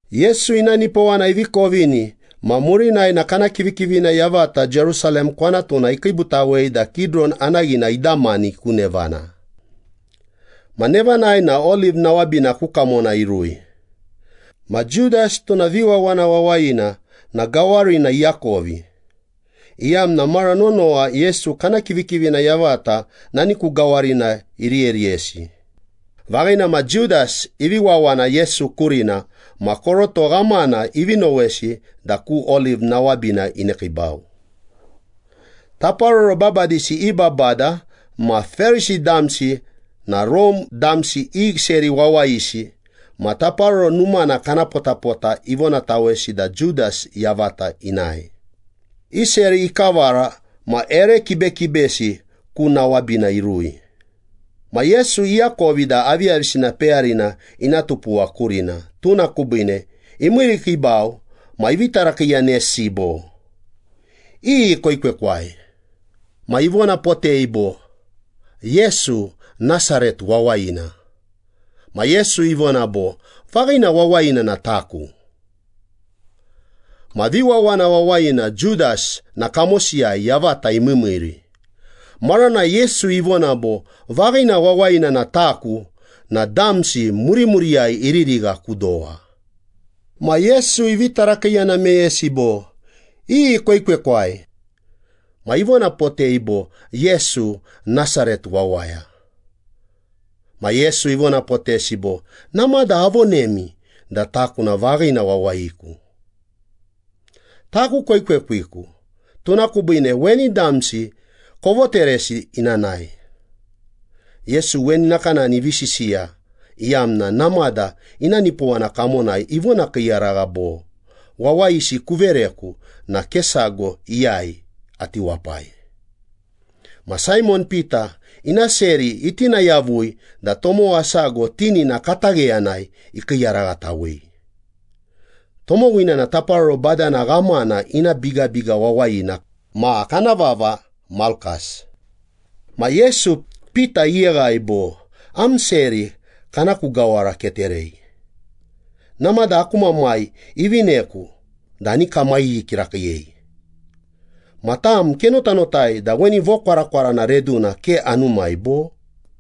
Yesu ina nipowana ivi kovini ma murinai na kana kivikivina yavata Jerusalem kwanatuna ikiibutawei da Kidiron anaghina idamani ku nevana. Ma nevanai na oliv nawabina ku kamona irui. Ma Judas, tuna viwawana wawayina na gawarina iakovi, iyamna mara nonowa Yesu kana kivikivina yavata nani ku gawarina iriyeriyesi. Vaghina ma Judas ivi wawana Yesu kurina ma koroto ghamana ivi nowesi da ku oliv nawabina inekiibau. Taparoro babadisi i babada ma Perisi damsi na Rome damsi i seri wawayisi ma Taparoro Numana kana potapota ivonatawesi da Judas yavata inae, i seri ikavara ma ere kibekibesi ku nawabina irui. Ma Yesu iakovi da aviyavisina peyarina ina tupuwa kurina, tuna kubiine imiirikiibau ma ivi tarakiiyanesi bo, “Iyi koekwekwai?” Ma ivonapotei bo, “Yesu, Nasaret wawayina.” Ma Yesu ivona bo, “Vaghina wawayina na taku.” Ma viwawana wawayina Judas na kamosiyai yavata imiimiiri. Maranai Yesu ivona bo, “Vaghina wawayina na taku” na damsi murimuriyai iririgha ku dowa. Ma Yesu ivi tarakiiyana meyesi bo, “Iyi koekwekwai?” Ma ivonapotei bo, “Yesu, Nasaret wawaya.” Ma Yesu ivonapotesi bo, “Namada avonemi da taku na vaghina wawayiku. Taku koekwekwiku, tuna kubiine weni damsi kovoteresi ina nae.” Yesu weni nakanani ivi sisiya iyamna namada ina nipowana kamonai ivonakiiyaragha bo, “Wawayisi kuvereku na ke sago iyai ati wapai.” Ma Saimon Pita ina seri itina yavui da tomowa sago tinina katagheyanai ikiiyaraghatawei. Tomowina na taparoro badana ghamana ina bigabiga wawayina ma kana vava Malkas. Ma Yesu, Pita iyeghai bo, “Am seri kana ku gawara keterei! Namada aku Mamai ivineku da ani kamaghi kirakiiyei. Ma tam, kenotanotai da weni vokwarakwarana reduna ke anumai, bo?”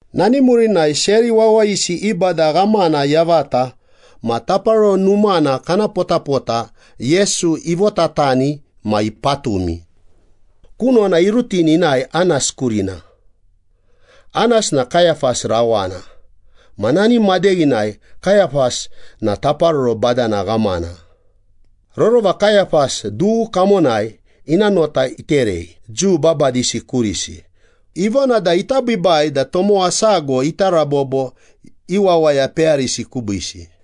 Nani murinai seri wawayisi i bada ghamana yavata ma Taparoro Numana kana potapota Yesu ivotatani ma ipatumi. Kunona irutini inae Anas kurina. Anas na Kayapas rawana ma nani madeghinai Kayapas na taparoro badana ghamana. Rorova Kayapas dughu kamonai ina nota iterei Jiu babadisi kurisi, ivona da ita biibai da tomowa sago ita rabobo i wawaya peyarisi kubiisi.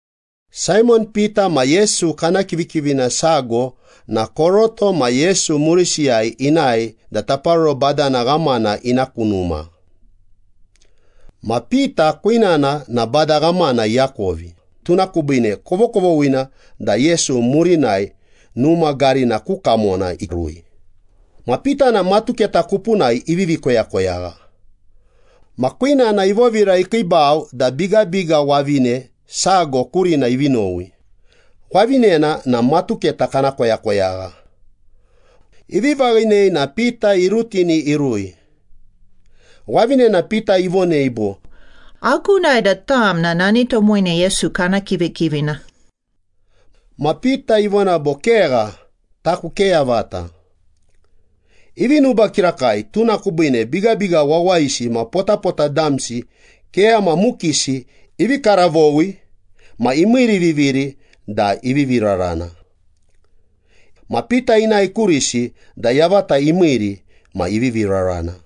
Saimon Pita ma Yesu kana kivikivina sago na koroto ma Yesu murisiyai inae da taparoro badana ghamana ina ku numa. Ma Pita kwinana na bada ghamana iakovi, tuna kubiine kovokovoghina da Yesu murinai numa garina ku kamona irui. Ma Pita na matuketa kupunai ivivi koyakoyagha. Ma kwinana ivovira ikiibau da bigabiga wavine sago kurina ivi nowi, wavinena na matuketa kana koyakoyagha. Ivi vaghinei na Pita irutini irui. Wavinena Pita ivonei bo, “Agunai da tam na nani tomowina Yesu kana kivikivina.” Ma Pita ivona bo, “Kegha. Taku ke yavata.” Ivi nuba kirakai tuna kubiine bigabiga wawayisi ma potapota damsi keyama mukisi ivi karavowi ma imiiriviviri da ivivi rarana. Ma Pita inae kurisi da yavata imiiri ma ivivi rarana.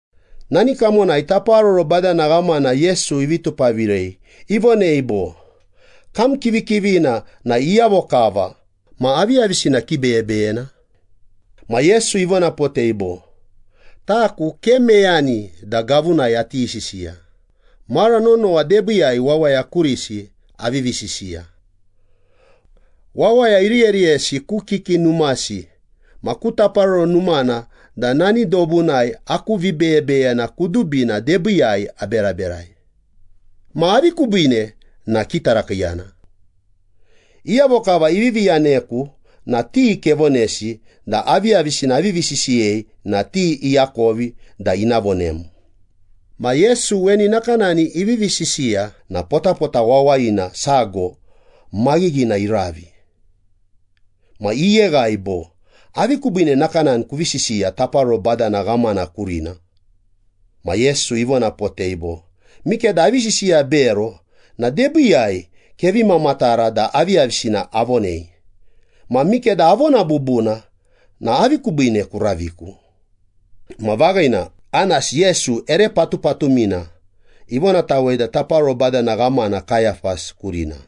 Nani kamonai taparoro badana ghamana Yesu ivi tupavirei, ivonei bo, “Kam kivikivina na iyavo kava ma aviyavisina kibeyebeyena?” Ma Yesu ivonapotei bo, “Taku ke meyani da gavunai ati sisiya, mara nonowa debiiyai wawaya kurisi avivi sisiya. Wawaya iriyeriyesi ku kiki numasi ma ku Taparoro Numana da nani dobunai aku vibeyebeyena kudubina debiiyai aberaberai. Ma avi kubiine na kitarakiiyana? Iyavo kava ivivi yaneku na ti kevonesi da aviyavisina avivi sisiyei na ti iakovi da ina vonem.” Ma Yesu weni nakanani ivivi sisiya na potapota wawayina sago maghighina iravi. Ma iyeghai bo, “Avi kubiine nakanani kuvi sisiya taparoro badana ghamana kurina?” Ma Yesu ivonapotei bo, “Mikeda avi sisiya bero na debiiyai kevi mamatara da aviyavisina avonei. Ma mikeda avona bubuna na avi kubiine kuraviku?” Ma vaghina Anas, Yesu ere patupatumina ivonatawei da taparoro badana ghamana Kayapas kurina.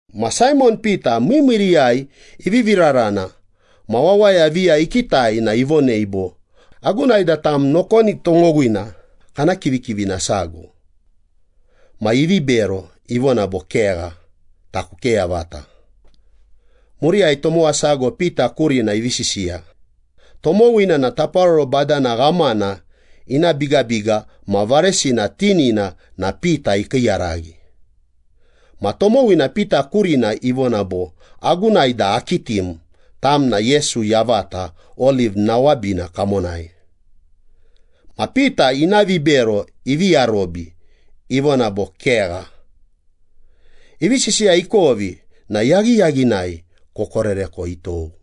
Ma Saimon Pita miimiiriyai ivivi rarana ma wawaya viya ikitai na ivonei bo, “Agunai da tam nokoni tomowina kana kivikivina sago.” Ma ivi bero, ivona bo, “Kegha. Taku ke yavata.” Muriyai tomowa sago Pita kurina ivi sisiya. Tomowina na taparoro badana ghamana ina bigabiga ma varesina tinina na Pita ikiiyaraghi. Ma tomowina Pita kurina ivona bo, “Agunai da akitim, tam na Yesu yavata oliv nawabina kamonai.” Ma Pita ina vibero ivi arobi, ivona bo, “Kegha.” Ivi sisiya ikovi na yaghiyaghinai kokoreko itou.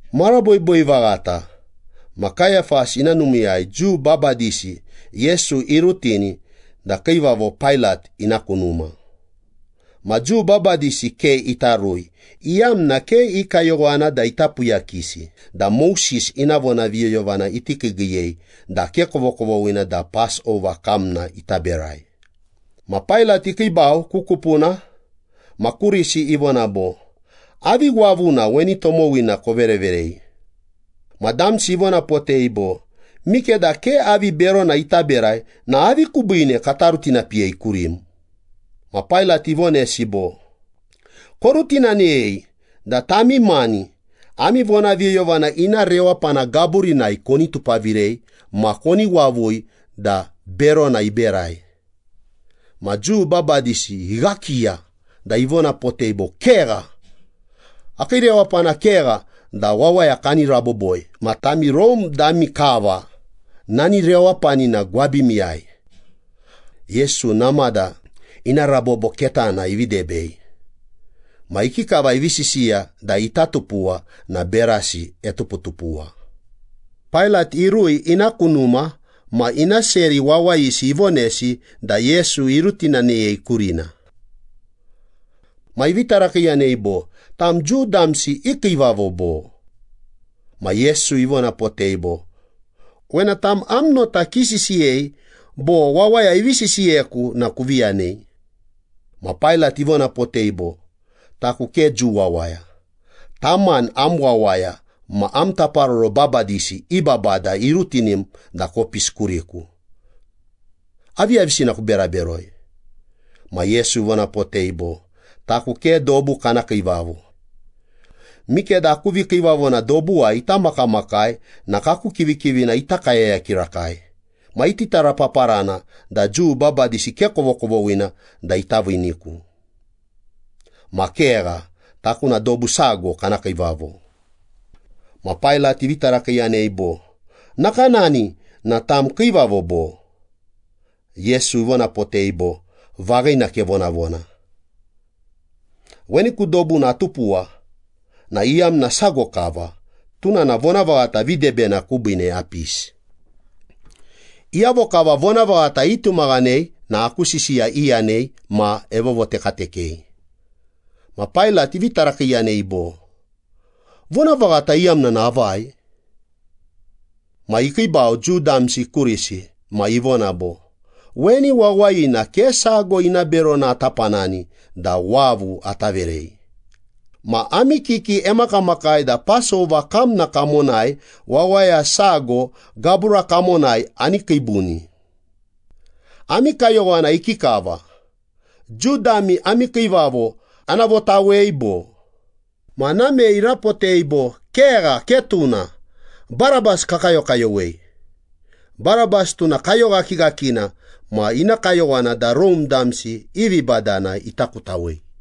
Mara boiboi vaghata ma Kayapas ina numiiyai Jiu babadisi Yesu irutini da kiivavo Pailat ina ku numa. Ma Jiu babadisi ke ita rui, iyamna ke i kayowana da ita puyakisi da Moses ina vonaviyoyovana iti kiigiiyei da ke kovokovoghina da Pasova kamna ita berai. Ma Pailat ikiibau ku kupuna ma kurisi ivona bo, “Avi wavuna weni tomowina kovereverei?” Ma damsi ivonapotei bo, “Mikeda ke avi berona ita berai na avi kubiine kata rutinapiyei kurim.” Ma Pailat ivonesi bo, “Korutinaneyei da tami mani ami vonaviyoyovana ina rewapana gaburinai koni tupavirei ma koni wavui da berona iberai.” Ma Jiu babadisi ighakiya da ivonapotei bo, “Kegha. Akii rewapana kegha da wawaya kani raboboi ma tami Rome dami kava nani rewapanina gwabimiyai.” Yesu namada ina rabobo ketana ivi debei. Ma ikikava ivi sisiya da ita tupuwa na berasi etuputupuwa. Pailat irui ina ku numa ma ina seri wawayisi ivonesi da Yesu irutinaneyei kurina. Ma ivi tarakiiyanei bo, “Tam Jiu damsi i kiivavo bo?” Ma Yesu ivonapotei bo, “Wena tam am nota kisisiyei, bo wawaya ivi sisiyeku na kuvi yanei?” Ma Pailat ivonapotei bo, “Taku ke Jiu wawaya. Tam mani am wawaya ma ami taparoro babadisi i babada irutinim da kopisi kuriku. Aviyavisina kubera beroi?” Ma Yesu ivonapotei bo, “Taku ke dobu kana kiivavo. Mikeda aku vikiivavona dobuwai ita makamakai na kaku kivikivina ita kayaya kirakai, ma iti tarapaparana da Jiu babadisi ke kovokovoghina da ita viiniku. Ma kegha, taku na dobu sago kana kiivavo.” Ma Pailat ivi tarakiiyanei bo, “Nakanani na tam kiivavo bo?” Yesu ivonapotei bo, “Vaghina kevonavona. Weni ku dobuna atupuwa na iyamna sago kava, tuna na vonavaghata videbena kubiine apisi. Iyavo kava vonavaghata itumaghanei na aku sisiya iyanei ma evovotekatekei.” Ma Pailat ivi tarakiiyanei bo, “Vonavaghata iyamna na avai?” Ma ikiibau Jiu damsi kurisi ma ivona bo, “Weni wawayina, ke sago ina berona ata panani da wavu ata verei. Ma ami kiki emakamakai da Pasova kamna kamonai wawaya sago gabura kamonai ani kiibuni. Ami kayowana ikikava, Jiu dami ami kiivavo ana votawei bo?” Ma namei irapotei bo, “Kegha, ke tuna. Barabas kakayokayowei!” Barabas tuna kayoghakighakina ma ina kayowana da Rome damsi i vibadana ita kutawei.